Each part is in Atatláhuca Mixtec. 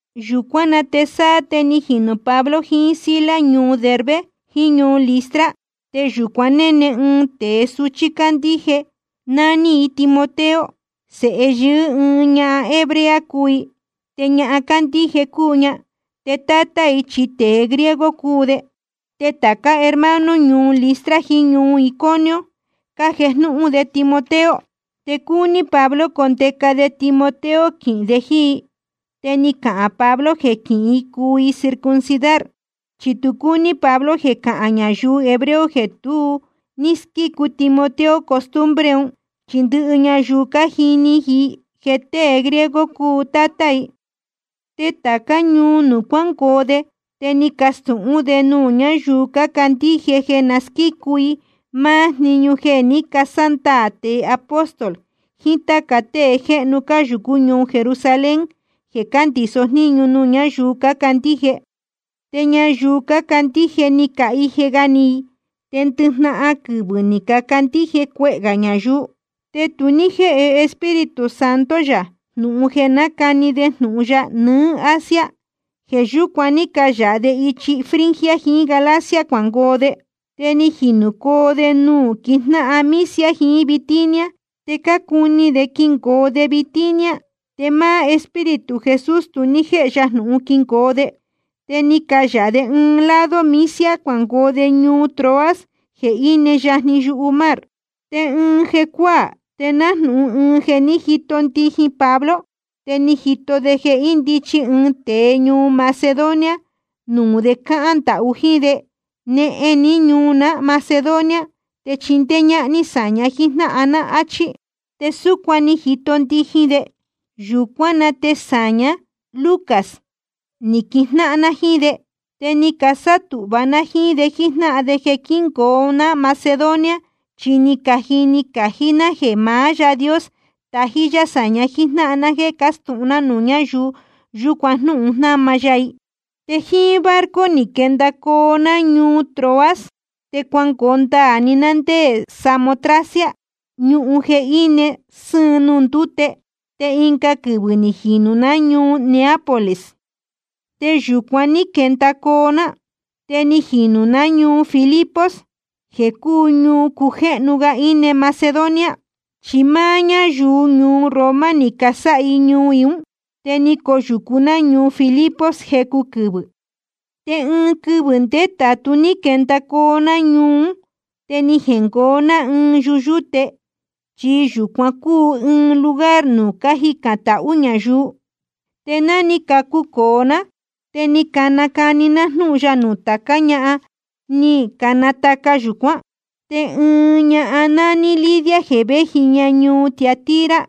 Yūcuán na te sáá te ni jinū Pablo jiín Silas ñuu Derbe jiín ñuu Listra. Te yūcuan néne ɨɨn tēe suchí cándíje, nání i Timoteo. Sēhe yɨɨ́ ɨɨn ñahan hebrea cúu i, te ñahan cándíje cúu ña. Te tátá i chi tēe griego cúu de. Te tācá hermano ñuu Listra jiín ñuu Iconio cájejnúhún de Timoteo. Te cúní Pablo condeca de Timoteo quihīn de jíín i. Te ni cahān Pablo jeē quihín i cuu i circuncidar, chi tu cúní Pablo jeē cahān ñayuu hebreo jeē tu ní squícu Timoteo costumbre un, chi ndɨhɨ ñayuu cájini i jeē tée griego cúu tátá i. Te tācá ñuu nuū cuángoo de te ni cacastūhún de nuū ñáyuu cácandíje jeē na squícu i máá jniñu jeē ní casándaā tēe apóstol jiín táca tée jéhnu cáyūcú ñuu Jerusalén jeē cándīso jníñu nuū ñáyuu cácandíje. Te ñayuu cácandíje ni cahije ga ni i. Te ndɨjnahan quɨvɨ̄ ni cacandíje cuehē gā ñayuu. Te tu ní jéhe Espíritu Santo yā jnūhun jeē nácani de jnūhun ya nɨ́ɨ́ Asia. Jeē yúcuan ní cayāha de ichi Frigia jiín Galacia cuangoo de. Te ni jinūcoo de nuū quijnáhan Misia jiín Bitinia. Te cácuni de quingoo de Bitinia, te máá Espíritu Jesús tu ní jéhe ya jnūhun quingoo de. Te ni cayāha de ɨɨn lado Misia cuangoo de ñuu Troas jeē íne yajni yumar. Te ɨɨn jecuáā te nájnūhun ɨɨn jēni ni jito ndijin Pablo, te ni jito de jeē índichi ɨɨn tēe ñuu Macedonia nuū de cáhán ndahú jíín de: Nehen ní ñuu ná Macedonia te chindéé ñáhán ní sāña jíjnáhan ná, áchí. Te súcuan ni jito ndijin de. Yūcuán na te sāña, Lucas, ni quijnáhan ná jíín de. Te ni casátūhva ná jíín de jíjnáhan de jeē quíngoo ná Macedonia, chi ni cajini cají ná jeē maá Yáā Dios tájí yá sāña jíjnáhan ná jéē castūhun ná nuū ñáyuu yūcuan jnúhun jnama ya i. Te jíín barco ni quendacoo ná ñuu Troas, te cuangoo ndaā‑ni ná ndé Samotracia, ñuhun jeē íne sɨ́ɨn nuū ndúte. Te ɨnga quɨvɨ̄ ni jinūcoo ná ñuu Neápolis. Te yūcuan ní quendacoo ná, te ni jinūcoo ná ñuu Filipos jeē cúu ñuu cujéhnu ga íne Macedonia, chi máá ñáyuu ñuu Roma ni casáha i ñuu i ún. Te ni coyūcu ná ñuu Filipos jecu quɨvɨ̄. Te ɨɨn quɨvɨ̄ ndétātu ní quendacoo ná ñuu ún, te ni jengoo ná ɨɨn yuyúte, chi yūcuan cúu ɨɨn lugar nuū cájicān tahú ñayuu. Te ni cacucōo ná, te ni canacani ná jnúhun ya nuū tācá ñahan ní canataca yūcuán. Te ɨɨn ña nání Lidia jeē véji ña ñuu Tiatira,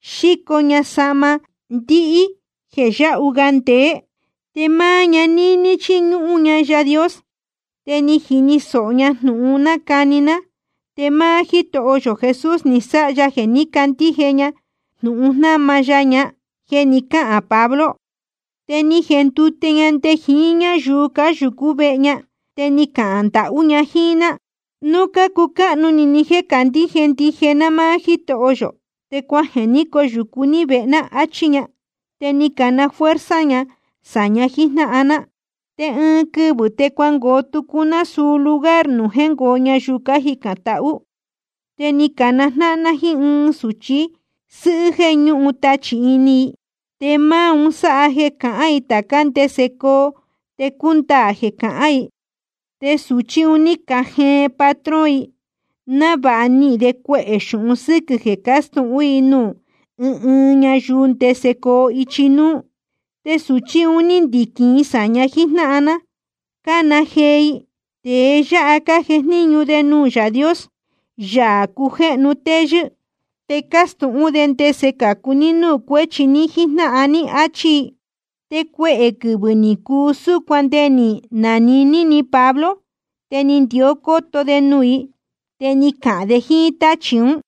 xíco ña sahma ndihí jéē yáhu ga ndeé. Te máá ña níní chíñúhún ña Yaā Dios. Te ni jini sōho ña jnūhun cánacani ná, te máá Jítoho yō Jesús ni sáha ya jeē ní candíje ña jnūhun jnáma ya ña jeē ni cáhān Pablo. Te ni jendute ña nde jiín ñáyuu cáyūcú vehe ña, te ni cahān ndahú ña jíín ná: Núu cácucáhnu ni ni jéē candíje ndije ná máá Jítoho yō, te cuajeē ní coyūcu ní vehe ná, áchí ña. Te ni cana fuerza ña sāña jíjnáhan ná. Te ɨɨn quɨvɨ̄ te cuangoo tucu ná suu lugar nuū jéngoo ñayuu cájicān tahú. Te ni canajnáhan ná jíín ɨɨn sūchi sɨ́hɨ́ jéē ñúhun tachī ini i, te máá un sáha jeē cahán i tācá ndese coo te cúndaā jeē cahán i. Te sūchí un ní cajeen patrón i, návāha nihīn de cuehē xūhun sɨ́quɨ̄ jeē cástūhún i nuū ɨɨn ɨɨn ñayuu ndese coo ichi núú. Te sūchí un ndíquín i sāña jíjnáhan ná cána jee i: Tēe yáha cájejníñu de nuū Yaā Dios, Yaā cujéhnu téyɨ́, te cácastūhún de ndese cācu ní núū cuéchi ní jíjnáhan ní, áchí i. Te cuehē quɨvɨ̄ ni cuu súcuan te nde ni jnaniní ni Pablo. Te ni ndió cóto de nuū i, te ni cahān de jíín táchī ún: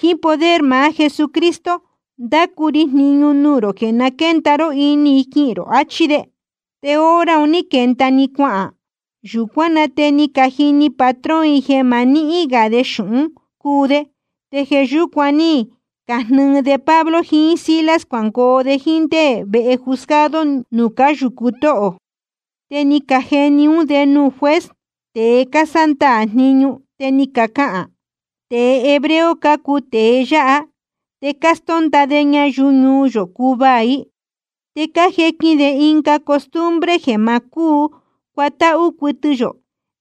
Jíín poder maá Jesucristo ndácu ri jniñu nuū rō jeē na quénda ró ini i quihīn rō, achí de. Te hora un ní quenda‑ni cuahān. Yūcuán na te ni cajini patrón i jeē ma níhín gā i xūhún cuu de, te jeē yúcuan ní cajnɨɨ de Pablo jiín Silas cuangoo jíín de nde vehe juzgado nuū cáyūcu tóhō. Te ni cajeni ún de nuū juez, tēe cásándaā jniñu, te ni cacahān: Tēe hebreo cácuu tēe yáha, te cástónda de ñayuu ñuu yō cúvaā i. Te cájequin de ɨnga costumbre jeē ma cúu cuatáhú cuɨtɨ yō,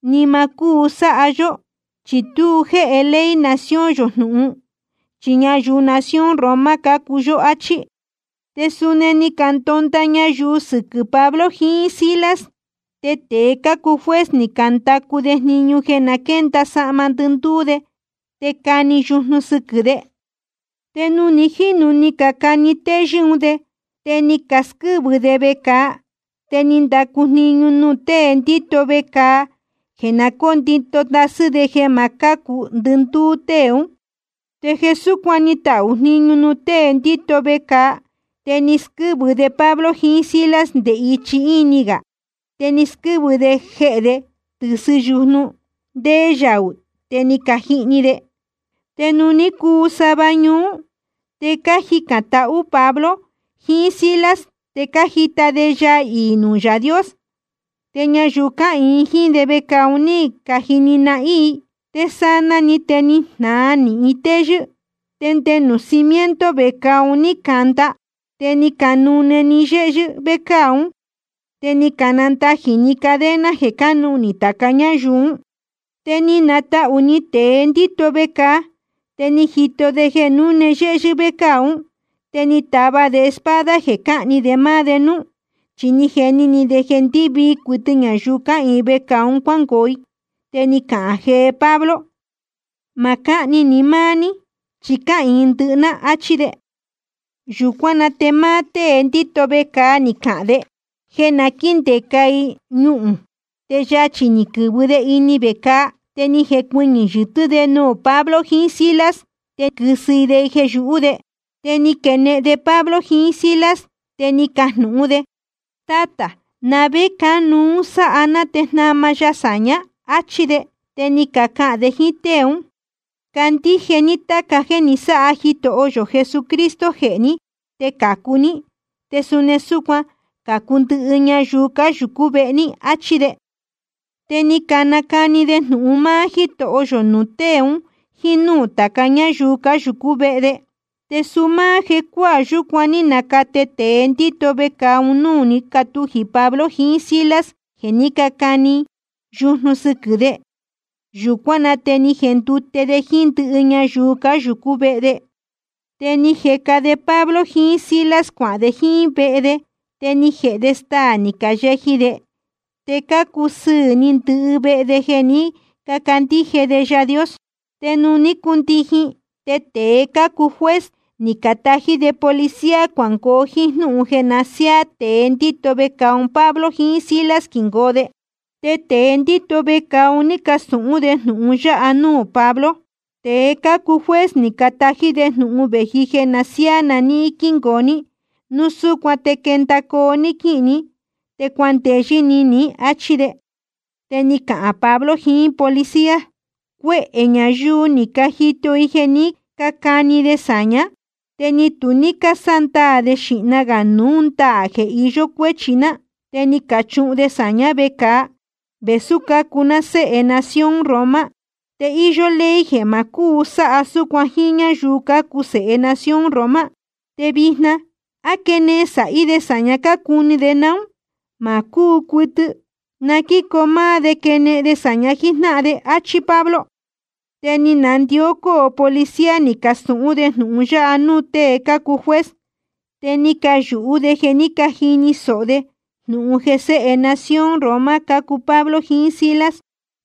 ni ma cúu sáha yó, chi tu jéhe ley nación yō jnūhun, chi ñayuu nación Roma cácuu yó, áchí. Te suni ni candonda ñayuu sɨquɨ̄ Pablo jiín Silas. Te tēe cácuu juez ni candacu de jniñu jeē na quénda sahma ndɨndúú de te cani yujnu sɨquɨ̄ de. Te nuū ni jínu ni cacani téyɨ́ un de, te ni casquɨ́vɨ de vecāa. Te ni candacu jniñu nuū tée ndíto vecāa jeē na cóndito ndasɨ́ de jeē ma cácu ndɨndúú tée ún. Te jeē súcuan ni tahū jniñu nuū tée ndíto vecāa te ni squɨ́vɨ de Pablo jiín Silas nde ichi íni gā, te ni squɨ́vɨ jehē de tɨ̄sɨn yujnu ndéé yaū te ni cajihni de. Te nuū ní cuu sava ñuú, te cájicān tahú Pablo jiín Silas, te cájita de yaa iī nuū maá Yáā Dios. Te ñayuu cáhīin jíín de vecāa un ní cajini nahín i. Te sanaa‑ni te ni jnāa nīhin téyɨ́, te nde nuū cimiento vecāa un ní canda. Te ni canune‑ni yéhyɨ́ vécāa ún, te ni canandajī‑ni cadena jeē cánuhnī tāca ñáyuu ún. Te ni natahū ni tēe ndíto vecāa, te ni jito de jeē núne yéhyɨ́ vécāa ún. Te ni tava de espada jeē cáhni de máá de núú, chi ni jeni ni de jeē ndɨvii cuɨtɨ ñayuu cáhīin vecāa un cuángoo i. Te ni cana jee Pablo: Ma cáhni ni máá ní, chi cáhīin ndɨhɨ ná, áchí de. Yūcuán na te máá tée ndíto vecāa ni cana de jeē na quíndeca i ñuhūn, te yachī ni quɨ̄vɨ de ini vecāa. Te ni jecuɨñɨ̄ yɨtɨ́ de nuū Pablo jiín Silas, te quɨ́sɨ i de jeē yūhú de. Te ni quenehen de Pablo jiín Silas, te ni cajnūhún de: Tátā, ¿na vé cánuú sáha ná te jnama ya sāñá? áchí de. Te ni cacahān de jíín tée ún: Candíje ní táca jéē ni sáha Jitoho yō Jesucristo jehē ní te cācu ní, te suni súcuan cācu ndɨhɨ ñayuu cáyūcú vehe ní, áchí de. Te ni canacani de jnūhun máá Jítoho yō nuū tée un jíín núū táca ñáyuu cáyūcú vehe de. Te suu máá jecuáā yúcuan ní nacate tēe ndíto vecāa un núū ní catujī Pablo jiín Silas jeē ní cacani yujnu sɨquɨ̄ de. Yūcuán na te ni jendute de jíín ndɨhɨ ñayuu cáyūcú vehe de. Te ni jeca de Pablo jiín Silas cuahān de jíín vehe de, te ni jēhe de staā ni cayeji de, te cácusɨɨ̄ ni ndɨhɨ de vehe de jeē ní cacandíje de Yaā Dios. Te nuū ní cundijin, te tēe cácuu juez ni catají de policía cuangoo jíín jnúhun jeē na siáá tēe ndíto vecāa un Pablo jiín Silas quingoo de. Te tēe ndíto vecāa un ní castūhún de jnūhun yáha núū Pablo: Tēe cácuu juez ni catají de jnūhun vēji jeē na siáá na níhín quíngoo ní. Núu súcuan te quendacoo ní quíhīn ní, te cuandeyɨ́ ni ní, áchí de. Te ni cahān Pablo jiín policía: Cuehē ñayuu ni cajito i jeē ní cacani de sāñá, te ni tu ní cásándaā de xīhna gā núu ndaā jeē iyó cuéchi ná. Te ni cachuhun de sāñá vecāa, vēsú cácuu ná séhe nación Roma, te íyó ley jeē ma cúu sáha súcuan jíín ñáyuu cácuu sēhe nación Roma. Te vijna ¿á quenehen sāhí de sāña cácuni de naún? Ma cúu cuɨtɨ. Na quícoo máá de quenehen de sāña jíjnáhan ná, áchí Pablo. Te ni canandió cóo policía ni castūhún de jnūhun yáha núū tée cácuu juez, te ni cayūhú de jeē ní cajini sōho de jnūhun jeē séhe nación Roma cácuu Pablo jiín Silas.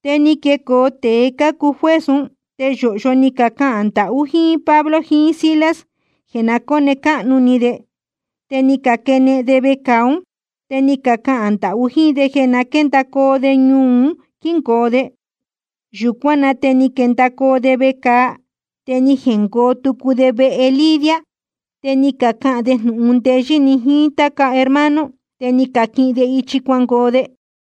Te ni quecoo tēe cácuu juez ún, te yōhyo ni cacahān ndahú jíín Pablo jiín Silas jeē na cóne cáhnu ni de. Te ni caquenehen de vecāa ún, te ni cacahān ndahú jíín de jeē na quéndacoo de ñuu un quíngoo de. Yūcuán na te ni quendacoo de vecāa, te ni jengoo tucu de vehe Lidia, te ni cacahān de jnūhun ndeyɨ́ ni jiín táca hermano. Te ni caquihin de ichi cuangoo de.